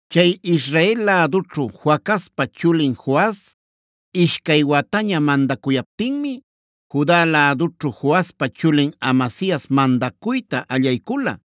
Chay Israel lädućhu Joacazpa chulin Joas ishcay wataña mandacuyaptinmi Juda lädućhu Joaspa chulin Amasias mandacuyta allaycula.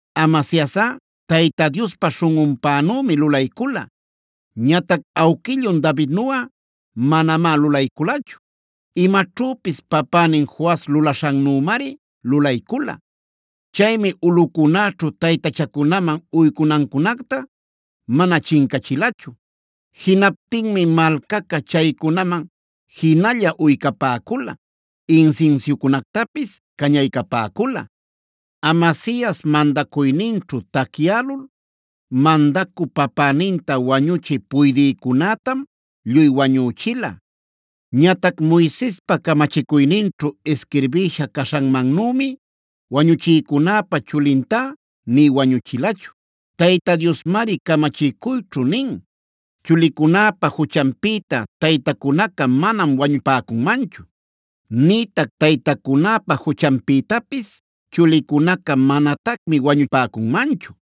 Amasiasꞌa Tayta Diospa śhunꞌunpänümi lulaycula. Ñatac awquillun Davidnuꞌa manamá lulayculachu. Imaćhüpis papänin Joas lulaśhannümari lulaycula. Chaymi ulꞌucunäćhu taytachacunaman uycunancunacta mana chincachilachu. Jinaptinmi malcaca chaycunaman jinalla uycapäcula, insinsiucunactapis cañaycapäcula. Amasias mandacuyninćhu tacyälul mandacü papäninta wañuchï puydïcunätam lluy wañüchila. Ñatac Moisespa camachicuyninćhu isquirbïsha caśhanmannümi wañuchïcunäpa chulintá nï wañuchilachu. Tayta Diosmari camachicuyćhu nin: “Chulicunäpa juchanpïta taytacunaca manam wañupäcunmanchu; nïtac taytacunäpa juchanpïtapis chulicunaca manatacmi wañupäcunmanchu.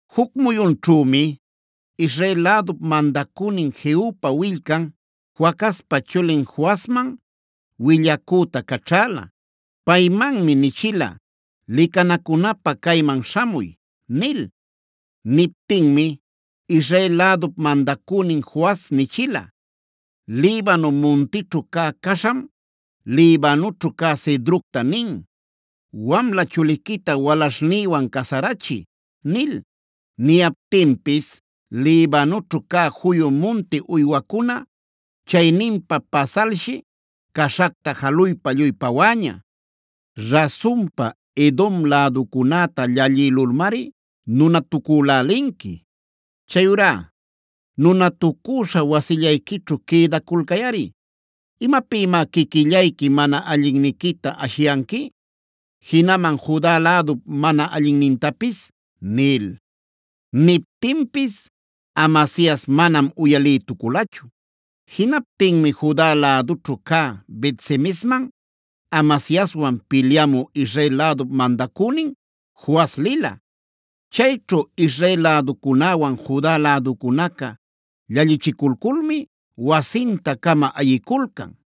Juc muyunćhümi Israel lädup mandacünin Jehupa willcan, Joacazpa chulin Joasman willacüta caćhäla. Paymanmi nichila: “Licanacunapä cayman śhamuy” nil. Niptinmi Israel lädup mandacünin Joas nichila: “Libano muntićhu cä caśham, Libanućhu cä cedrocta nin: ‘Wamla chuliquita walaśhnïwan casarachiy’ nil. Niyaptinpis Libanućhu cä juyu munti uywacuna, chayninpa pasalshi caśhacta jaluypa lluy pawäña. Rasunpa, Edom läducunäta llallïlulmari nunatucülälinqui. Chayurá nunatucüśha wasillayquićhu quïdaculcayꞌari. ¿Imapïmá quiquillayqui mana allinniquita ashiyanqui, jinaman Juda lädup mana allinnintapis?” nil. Niptinpis Amasias manam uyalïtuculachu. Jinaptinmi Juda lädućhu cä Bet-semesman Amasiaswan pilyamü Israel lädup mandacünin Joas lila. Chayćhu Israel läducunäwan Juda läducunaca llallichiculculmi wasinta-cama ayiculcan.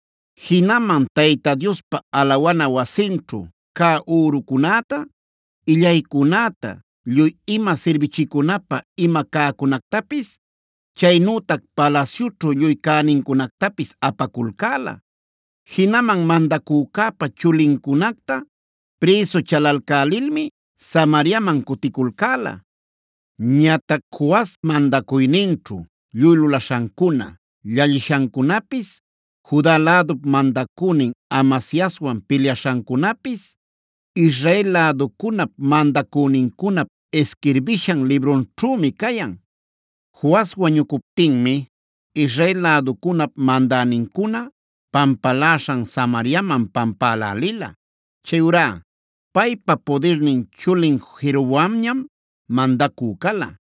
Jinaman Tayta Diospa alawana wasinćhu cä ürucunäta, illaycunäta, lluy ima sirbichicunapä ima cäcunactapis, chaynütac palasyućhu lluy cänincunactapis apaculcäla. Jinaman mandacücäpa chulincunacta prïsu chalalcälilmi Samariaman cuticulcäla. Ñatac Joas mandacuyninćhu lluy lulaśhancuna, llallishancunapis, Juda lädup mandacünin Amasiaswan pilyaśhancunapis Israel läducunap mandacünincunap isquirbishan librunćhümi cayan. Joas wañucuptinmi Israel läducunap mandänincuna pampaläśhan Samariaman pampälälila. Chayurá paypa pudirnin chulin Jeroboamñam mandacü cala.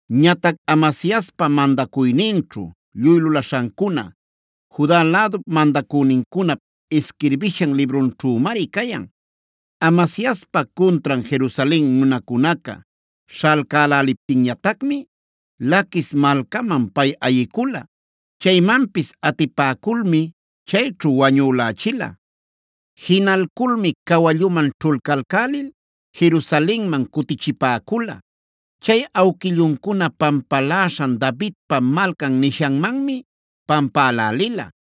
Ñatac Amasiaspa mandacuyninćhu lluy lulaśhancuna Juda lädup mandacünincunap isquirbishan librunćhümari cayan. Amasiaspa cuntran Jerusalen nunacunaca śhalcäläliptinñatacmi Laquis malcaman pay ayicula. Chaymanpis atipäculmi chayćhu wañülächila. Jinalculmi cawalluman ćhulcalcälil Jerusalenman cutichipäcula. Chay awquilluncuna pampaläśhan Davidpa Malcan nishanmanmi pampälälila.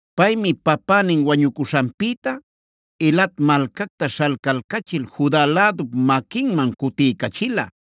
Paymi papänin wañucuśhanpïta Elat malcacta śhalcalcachil Juda lädup maquinman cutiycachila.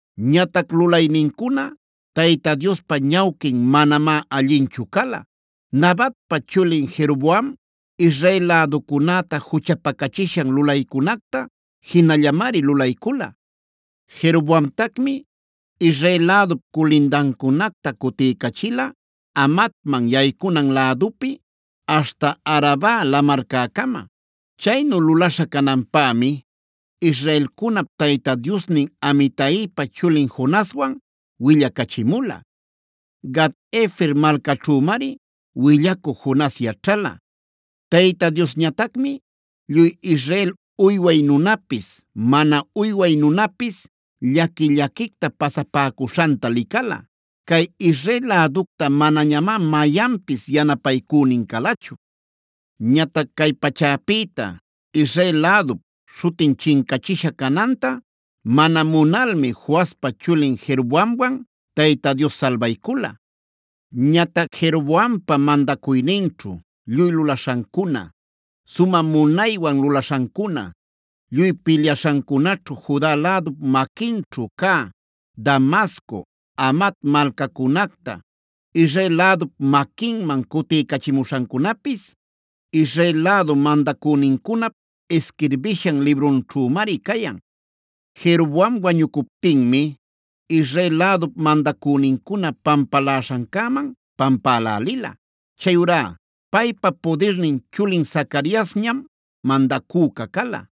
Ñatac lulaynincuna Tayta Diospa ñawquin manamá allinchu cala. Nabatpa chulin Jeroboam Israel läducunäta juchapacachishan lulaycunacta jinallamari lulaycula. Jeroboamtacmi Israel lädup culindancunacta cutiycachila Hamatman yaycunan lädupi aśhta Araba Lamarcäcama. Chaynu lulaśha cananpämi israelcunap Tayta Diosnin Amitaipa chulin Jonaswanb willacachimula. Gat-hefer malcaćhümari willacü Jonas yaćhala. Tayta Diosñatacmi lluy Israel uyway nunapis, mana uyway nunapis llaqui-llaquicta pasapäcuśhanta licala. Cay Israel läducta manañamá mayanpis yanapaycünin calachu. Ñatac cay pachäpïta Israel lädup śhutin chincachisha cananta mana munalmi Joaspa chulin Jeroboamwan Tayta Dios salbaycula. Ñatac Jeroboampa mandacuyninćhu lluy lulaśhancuna, sumä munaywan lulaśhancuna, lluy pilyaśhancunaćhu Juda lädup maquinćhu cä Damasco, Hamat malcacunacta Israel lädup maquinman cutiycachimuśhancunapis Israel lädu mandacünincunap isquirbishan librunćhümari cayan. Jeroboam wañucuptinmi Israel lädup mandacünincuna pampaläśhancäman pampälälila. Chayurá paypa pudirnin chulin Zacariasñam mandacüca cala.